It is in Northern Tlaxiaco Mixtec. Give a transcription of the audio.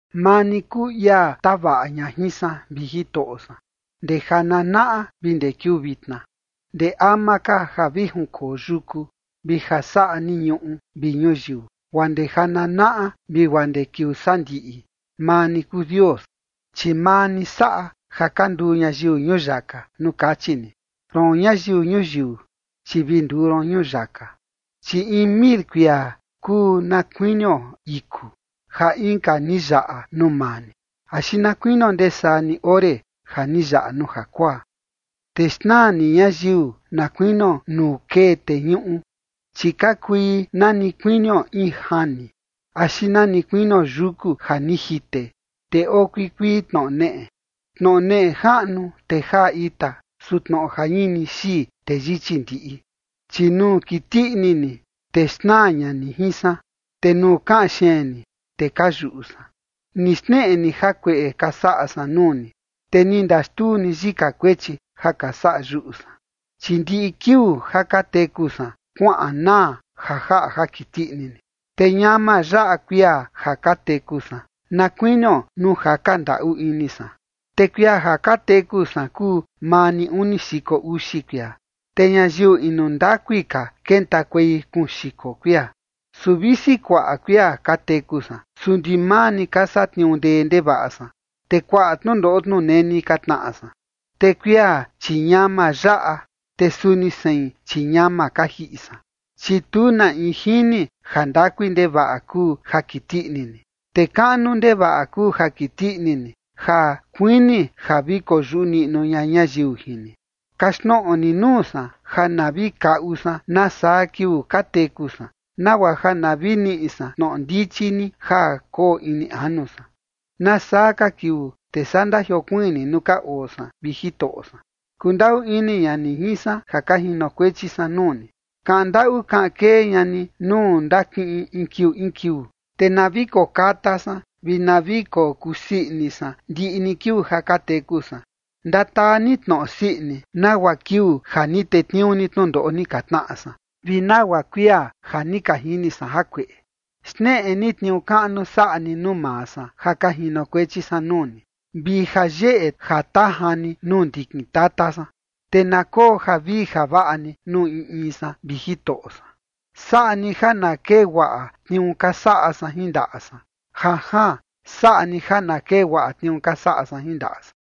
Maa ni kuu ia tavaꞌa ña jin san, vi Jitoꞌo san, ndee jananaꞌa vi ndee kiuu vitna. Ndee ama ka ja vi junkoo yuku, vi ja saꞌa ni ñuꞌu vi ñuyiu, guaa ndee jananaꞌa vi guaa ndee kiuu sandiꞌi, maa ni kuu Dios. Chi maa ni saꞌa ja ka nduu ñayiu ñuyaka, nuu kachi ni: “Roon, ñayiu ñuyiu, chi vi nduu ron ñuyaka”. Chi in mil kuia kuu na kuinio iku ja inka ni yaꞌa nuu maa ni, axi na kuinio ndesaa ni ore ja ni yaꞌa nuu jakuaa. Te xnaa ni ñayiu na kuinio nuu kee teñuꞌu, chi ka kui na ni kuinio in jani, axi na ni kuinio yuku ja ni jite, te oo kuikuii tnoꞌo neꞌe. Tnoꞌo neꞌe jaꞌnu, te jaa ita, su tnoꞌo jañini xii, te yichi ndiꞌi. Chi nuu kiti ini ni, te xnaa ña ni jin san, te nuu kaꞌan xeen ni, te ka yuꞌu san. Ni xneꞌe ni jakueꞌe ka saꞌa san nuu ni, te ni ndaxtuu ni yika kuechi ja ka saꞌa yuꞌu san. Chi ndiꞌi kiuu ja ka teku san kuaꞌan naa ja jaꞌa ja kiti ini ni, te ñama yaꞌa kuia ja ka teku san, na kuinio nuu jaka ndaꞌu ini san. Te kuia ja ka teku san kuu maa ni uni xiko uxi kuia, te ñayiu inu ndakui ka kentakuei kuun xiko kuia. Su visi kuaꞌa kuia ka teku san, su ndimaa ni ka satniuu ndee ndevaꞌa san, te kuaꞌa tnundoꞌo tnuneni ka tnaꞌa san, te kuia, chi ñama yaꞌa, te suni sein, chi ñama ka jiꞌi san. Chi tu na in jini jandakui ndevaꞌa kuu ja kiti ini ni, te kaꞌnu ndevaꞌa kuu ja kiti ini ni ja kuini ja vi koyuꞌu niꞌnu ña ñayiu jin ni. Kaxtnoꞌo ni nuu san ja na vi kaꞌu san nasaa kiuu ka teku san, nagua ja na vi niꞌi san tnoꞌo ndichi ni ja koo ini anu san. ¿Nasaa ka kiuu te saa ndajiokuiin ni nuu ka oo san, vi Jitoꞌo san? Kundaꞌu ini ña ni jin san ja ka jinokuechi san nuu ni. Kaꞌan ndaꞌu kaꞌan kee ña ni nuu ndakiꞌin in kiuu in kiuu, te na vi kokata san vi na vi kokusii ini san ndiꞌi ni kiuu ja ka teku san. Ndataa ni tnoꞌo sii ini, nagua kiuu ja ni tetniuu ni tnundoꞌo ni ka tnaꞌa san, vi nagua kuia ja ni ka jini san jakueꞌe. Xneꞌe ni tniuu kaꞌnu saꞌa ni nuu maa san ja ka jinokuechi san nuu ni, vi jayeꞌe jatajan ni nuu ndikin tata san. Te na koo javii javaꞌa ni nuu in in san, vi Jitoꞌo san. Saꞌa ni ja na kee guaꞌa tniuu ka saꞌa san jin ndaꞌa san. Janjaan, saꞌa ni ja na kee guaꞌa tniuu ka saꞌa san jin ndaꞌa san.